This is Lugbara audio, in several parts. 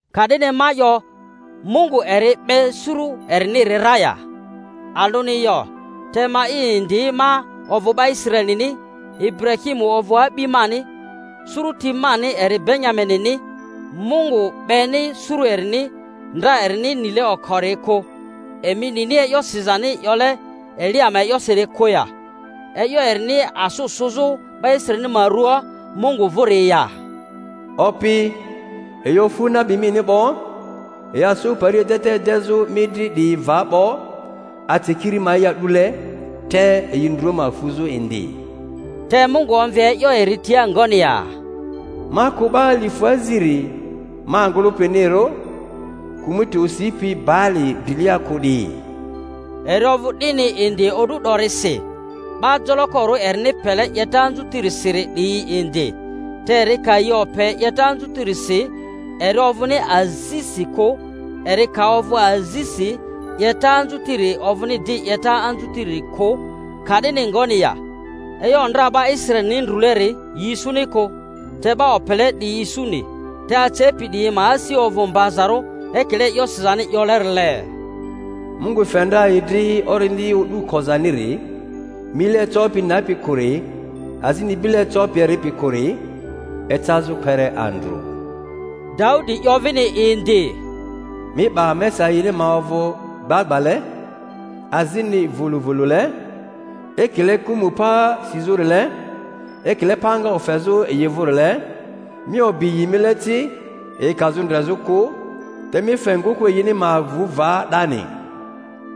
Ka'dini ma 'yo, Mungu eri 'be suru eriniri ra ya? Alᴜni yo! Te ma'i indi ma ovᴜ 'ba Israelini, Iburahimu ovᴜ a'bi mani, suruti mani eri Benyaminini. Mungu 'beni suru erini, ndra erini nile okori kᴜ. Emi nini e'yo sizani 'yole Elia ma e'yosiri kᴜ ya, e'yo erini asᴜ sᴜzᴜ 'ba Israelini ma ruaa Mungu vᴜri ya? Opi, yi ofu nabi mini 'bo, yi asᴜ pari edeta edezᴜ mi dri 'diyi va 'bo, ace kiri ma'i a'dule, te yi ndru ma fuzᴜ indi. Te Mungu omvi e'yo eri tia ngoni ya? Ma kᴜ 'ba alifᴜ aziri ma ngᴜlᴜpinirᴜ, kᴜmᴜti osipi Baali drilia kᴜ 'diyi. Eri ovᴜ 'dini indi o'du 'dorisi, 'ba jolokorᴜ erini pele 'yeta anzutirisi 'diyi indi. Te eri ka yi ope 'yeta anzutirisi, eri ovᴜni azisi kᴜ; eri ka ovᴜ azisi, 'yeta anzutiri ovᴜni di 'yeta anzutiri kᴜ. Ka'dini ngoni ya? E'yo ndra 'ba Israelini ndruleri, yi isuni kᴜ. Te 'ba opele 'diyi isuni, te acepi 'diyi ma asi ovᴜ mbazarᴜ, ekile e'yo sizani 'yolerile, Mungu fe ndra yi dri orindi o'du kozaniri, mile ecopi nepi kᴜri, azini bile ecopi eripi kᴜri, ecazᴜ kpere andrᴜ. Daudi 'yo vini indi, Mi 'ba mesa yini ma ovᴜ gbagbale, azini vᴜlᴜvᴜlᴜle, ekile kᴜmᴜ pa sizᴜrile, ekile panga ofezᴜ yi vᴜrile; mi obi yi mile ci yi kazᴜ ndrezᴜkᴜ, te mi fe ngᴜkᴜ yini ma avu va 'dani.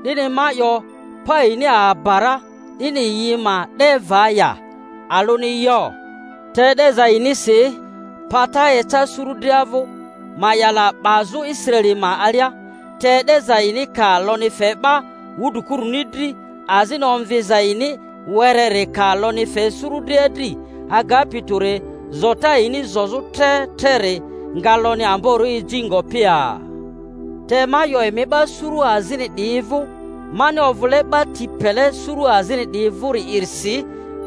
'Dini ma 'yo, pa yini aba ra 'dini yi ma 'de va ya? Alᴜni yo! Te e'deza yinisi pata eca suru dria vᴜ, ma'yala 'bazᴜ Israeli ma alia. Te e'deza yini ka lonyi fe 'ba wudrikuruni dri, azini omviza yini wereri ka lonyi fe suru dria dri, agapi tᴜri, zota yini zozᴜ tre treri nga lonyi amborᴜ eji ngopi ya! Te ma 'yo emi 'ba suru azini 'diyi vᴜ. Mani ovᴜle 'ba tini pele suru azini 'diyi vᴜri'irisi,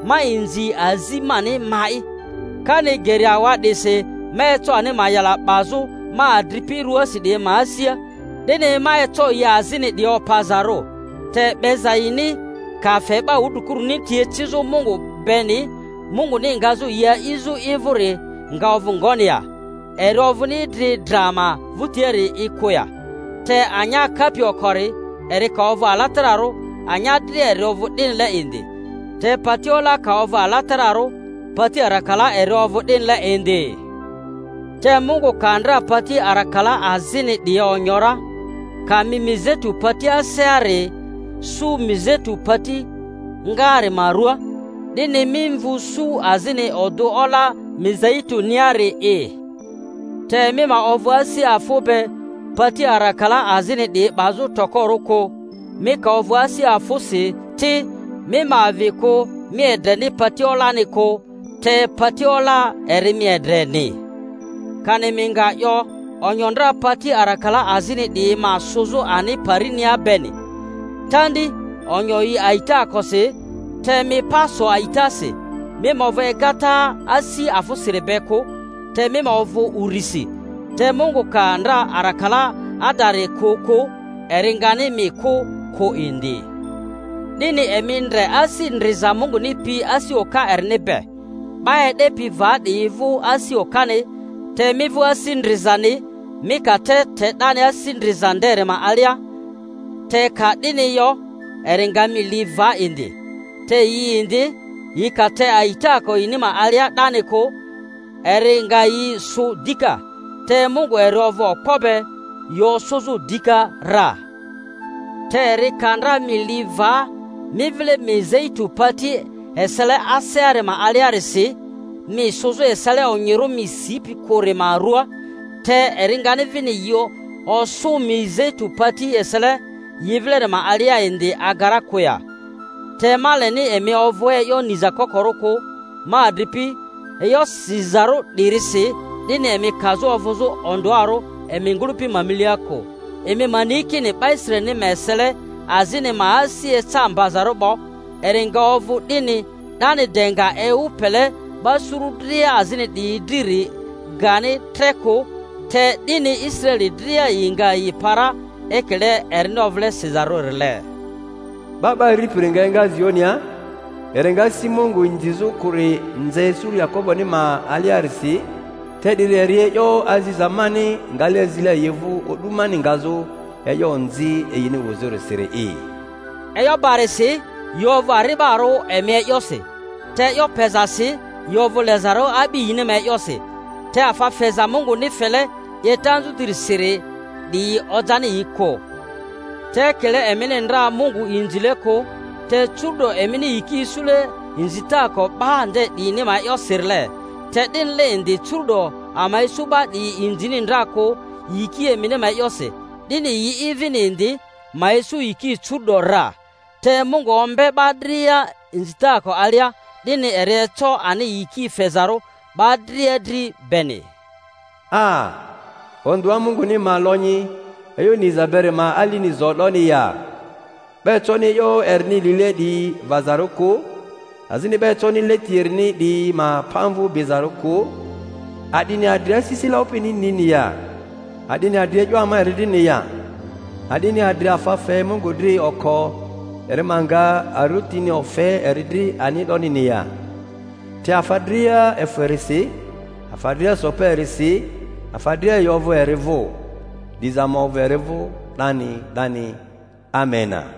ma inzi azi mani ma'i, kani geri awa'disi ma eco ani ma'yala 'bazᴜ ma adripi ruasi 'diyi ma asia, 'dini ma eco yi azini 'diyi opazarᴜ. Te 'beza yini ka fe 'ba wudrikuruni ti ecizᴜ Mungu beni, Munguni ngazᴜ yi a'izᴜ i vᴜri nga ovᴜ ngoni ya? Eri ovᴜni idri dra ma vᴜtiari'i kᴜ ya? Te anya kapi okori eri ka ovᴜ alatararᴜ, anya dria eri ovᴜ 'dinile indi; te pati ola ka ovᴜ alatararᴜ, pati arakala eri ovᴜ 'dinile indi. Te Mungu ka ndra pati arakala azini 'diyi onyo ra, ka mi mizeitu pati aseari sᴜ mizeitu pati ngaari ma ruaa, 'dini mi mvu su azini odᴜ ola mizei-tuniari'i, te mi ma ovᴜ asi afᴜ be pati arakala azini 'diyi 'bazᴜ tokorᴜ kᴜ. Mi ka ovᴜ asi afᴜsi ti, mi ma avi kᴜ mi edreni pati olani kᴜ, te pati ola eri mi edreni. Kani mi nga 'yo, Onyo ndra pati arakala azini 'diyi ma sᴜzᴜ ani parinia beni. Tandi! Onyo yi a'itaakosi, te mi pa so a'itasi. Mi ma ovᴜ egata asi afᴜsiri be kᴜ, te mi ovᴜ urisi. Te Mungu ka ndra arakala adari kᴜ kᴜ, eri ngani mi kᴜ kᴜ indi. 'Dini emi ndre asi ndriza Munguni pi asi oka erini be: 'ba e'depi va 'diyi vᴜ asi okani, te mi vᴜ asi ndrizani mi ka te 'dani asi ndriza nderi ma alia; te ka 'dini yo eri nga mi li va indi. Te yi indi, yi ka te a'itaako yini ma alia 'dani kᴜ, eri nga yi sᴜ dika, te Mungu eri ovᴜ okpo be yi osᴜzᴜ dika ra. Te eri ka ndra mi li va mi vile mizeitu pati esele aseari ma aliarisi, mi sᴜzᴜ esele onyirᴜ mi sipi kᴜri ma ruaa; te eri ngani vini yi osᴜ mizeitu pati esele yi vileri ma alia indi aga ra kᴜ ya? Te ma leni emi ovᴜ e'yo niza kokorᴜ kᴜ, ma adripi, e'yo zizarᴜ 'dirisi, 'dini emi kazᴜ ovᴜzᴜ ondᴜarᴜ emi ngᴜlᴜpi ma milia kᴜ; emi ma ni kini 'ba Israelini ma esele azini ma asi eca mbazarᴜ 'bo, eri nga ovᴜ 'dini 'dani de nga ewu pele 'ba suru dria azini 'diyi driri gani tre kᴜ, te 'dini Israeli dria yi nga yi pa ra; ekile erini ovᴜle sizarᴜrile, Ba 'ba Aripiri nga enga Zionia, eri nga asi Mungu inzizᴜ kᴜri nze suru Yakoboni ma aliarisi; te 'diri eri e'yo aziza mani ngale azile yi vᴜ o'du mani ngazᴜ e'yo onzi yini wuzᴜrisiri'i. E'yo barisi, yi ovᴜ ari'barᴜ emi ma e'yosi; te e'yo pezasi yi ovᴜ lezarᴜ a'bi yini ma e'yosi. Te afa feza Munguni fele 'yeta anzutirisi 'diyi ojani yi kᴜ. Te ekile emini ndra Mungu inzile kᴜ, te curu'do emini yiki isule inzitaako 'ba nde 'diyini ma e'yosirile, te 'dinile indi curu'do ama isu 'ba 'diyi inzini ndra kᴜ yiki emini ma e'yosi, 'dini yi'i vini indi ma isu yiki curu’do ra. Te Mungu ombe 'ba dria inzitaako alia, 'dini eri eco ani yiki fezarᴜ 'ba dria dri beni. 'A 'a, ondᴜa Munguni ma lonyi e'yo niza beri ma alini zo 'doni ya! 'Ba econi e'yo erini lile 'diyi vazarᴜ kᴜ, azini 'ba econi leti erini 'diyi ma pamvᴜ bizarᴜ kᴜ! A'dini adri asisile Opini nini ya? A'dini adri e'yo ama eri drini ya? A'dini adri afa fe Mungu dri oko eri ma nga arotini ofe eri dri ani ndonini ya? Te afa dria efᴜ erisi, afa dria so pa erisi, afa dria yi ovᴜ eri vᴜ. Diza ma ovᴜ eri vᴜ 'dani 'dani. Amena.